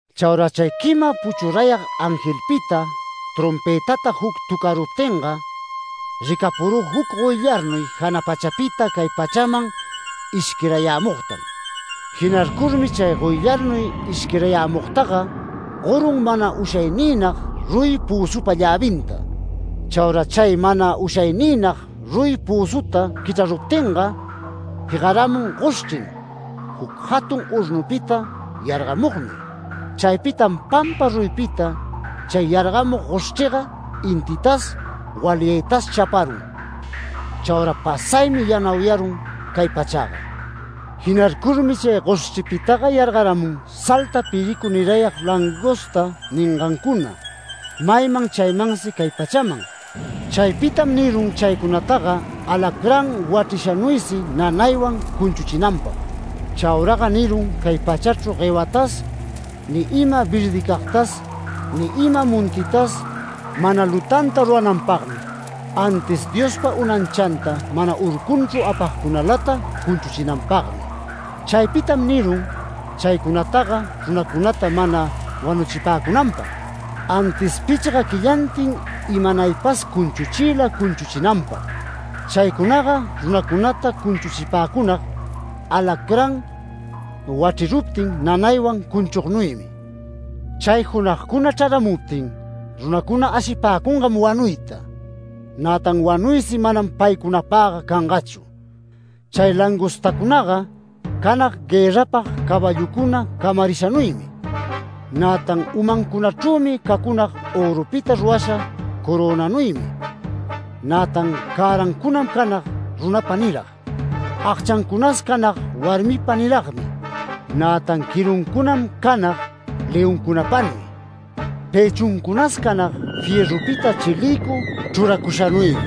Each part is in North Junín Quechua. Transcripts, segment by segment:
Chaura chay quima puchurayag angelpita trompëtata juc töcaruptinga, ricapurü juc goyllarnuy jana pachapita cay pachaman ishquirayämugtam. Jinarcurmi chay goyllarnuy ishquirayämugtaga gorun mana ushayniynag ruyi pözupa llävinta. Chaura chay mana ushayniynag ruyi pözuta quichraruptinga jegaramun goshchrim juc jatun hornupita yargamugnuy. Chaypitam pampa ruyipita chay yargamug goshchriga intitas, walyaytas chaparun. Chaura pasaymi yanauyarun cay pachaga. Jinarcurmi chay goshchripitaga yargaramun salta piricu nirayag ‘langosta’ ningancuna, mayman chaymansi cay pachaman. Chaypitam nirun chaycunataga alacrán wachrishanuysi nanaywan cunchuchinanpag. Chauraga nirun cay pachachru guewatas ni ima verdicagtas, ni ima montitas, mana lutanta rurananpagmi, antis Diospa unanchanta mana urcunchru apagcunalata cunchuchinanpagmi. Chaypitam nirun chaycunataga runacunata mana wanuchipäcunanpag, antis pichga quillantin imanaypas cunchuchiyla cunchuchinanpag. Chaycunaga runacunata cunchuchipäcunag alacrán wachriruptin nanaywan cunchugnuymi. Chay junagcuna chraramuptin, runacuna ashipäcungam wanuyta, nätan wanuysi manam paycunapagga cangachu. Chay langostacunaga canag guërrapag caballucuna camarishanuymi, nätan umancunachrüsi cacunag örupita rurasha corönanuymi, nätan cärancunam canag runapa nirag. Agchancunas canag warmipa niragmi, nätan quiruncunam canag leoncunapanuy. Pëchuncunas canag fierrupita chilïcu chruracushanuymi.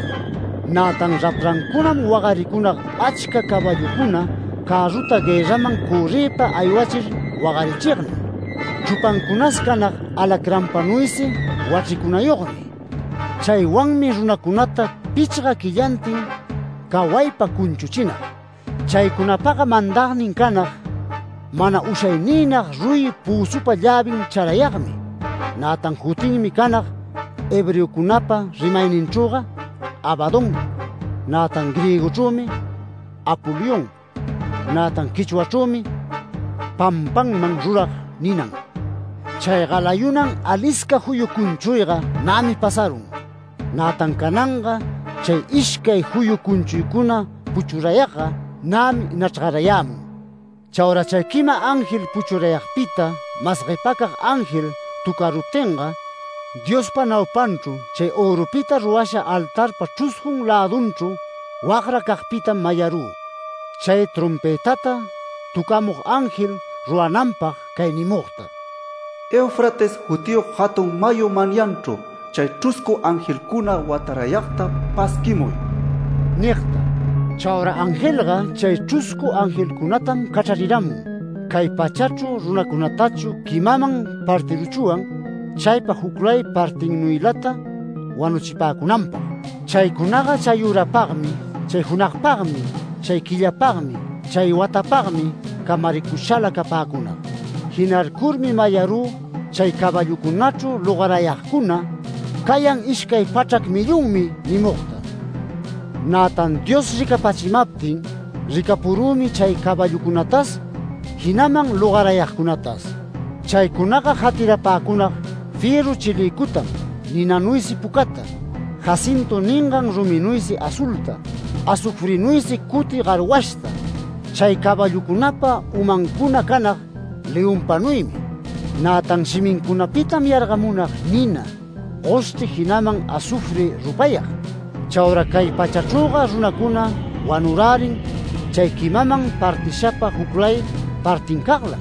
Nätan raprancunam wagaricunag achca caballucuna cärruta guërraman cörriypa aywachir wagarichignuy. Chrupancunas canag alacranpanuysi wachricunayogmi. Chaywanmi runacunata pichga quillantin cawaypa cunchuchinag. Chaycunapaga mandagnin canag, mana ushayniynag ruyi pözupa llävin charayagmi. Nätan jutinmi canag hebreocunapa rimayninchrüga ‘Abadón’, nätan griegochrümi ‘Apolión’. (Nätan quechuachrümi ‘Pampanman rurag’ ninan.) Chay galayunan alisca juyu cunchuyga nämi pasarun. Nätan cananga chay ishcay juyu cunchuycuna puchurayagga nämi nachrgarayämun. Chaura chay quima ángel puchurayagpita mas guepacag ángel töcaruptinga, Diospa naupanchru chay örupita rurasha altarpa chruscun lädunchru wagracagpitam mayarü, chay trompëtata töcamug ángel rurananpag cay nimugta: “Eufrates jutiyog jatun mayu manyanchru chay chruscu angelcuna watarayagta pasquimuy” nigta. Chaura angelga chay chruscu angelcunatam cachrarirämun. Cay pachachru runacunatachu quimaman partiruchwan chaypa juclay partinnuylata wanuchipäcunanpag. Chaycunaga chayürapagmi, chay junagpagmi, chay quillapagmi, chay watapagmi, camaricushala capäcunag. Jinarcurmi mayarü chay caballucunachru logarayagcuna “Cayan ishcay pachrac millonmi” nimugta. Nätan Dios ricapachimaptin, ricapurümi chay caballucunatas jinaman logarayagcunatas. Chaycunaga jatirapäcunag fierru chilïcutam ninanuysi pucata, ‘jacintu’ ningan ruminuysi azulta, azufrinuysi cuti garwashta. Chay caballucunapa umancuna canag leonpanuymi, nätan shimincunapitam yargamunag nina, goshchri jinaman azufri rupayag. Chaura cay pachachrüga runacuna wanurärin chay quimaman partishapa juclay partincaglam.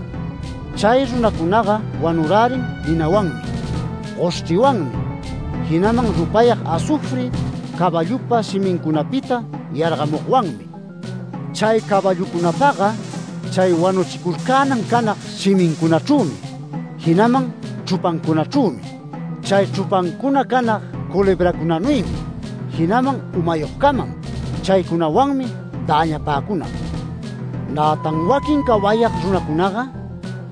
Chay runacunaga wanurärin ninawanmi, goshchriwanmi, jinaman rupayag azufri caballupa shimicunapita yargamugwanmi. Chay caballucunapaga chay wanuchicurcänan canag shimincunachrümi jinaman chrupancunachrümi. Chay chrupancuna canag culebracunanuymi jinaman umayogcamam. Chaycunawanmi däñapäcunag. Nätan waquin cawayag runacunaga,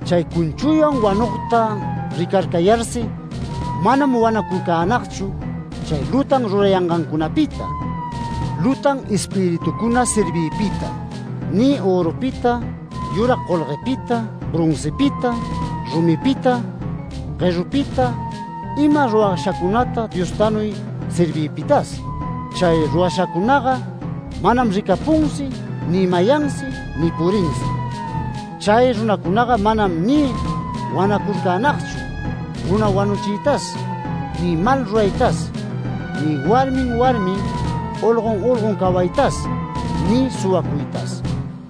chay cunchuywan wanugta ricarcayarsi manam wanacurcänagchu chay lutan rurayangancunapita, lutan espiritucuna servigpita, ni örupita, yurag golguepita, broncipita, rumipita, guerupita ima rurashacunata Diostanuy serviypitas. Chay rurashacunaga manam ricapunsi, ni mayansi, ni purinsi. Chay runacunaga manam ni wanacurcänagchu, runa wanuchiytas, ni mal ruraytas, ni warmin warmin, olgon olgon cawaytas, ni suwacuytas.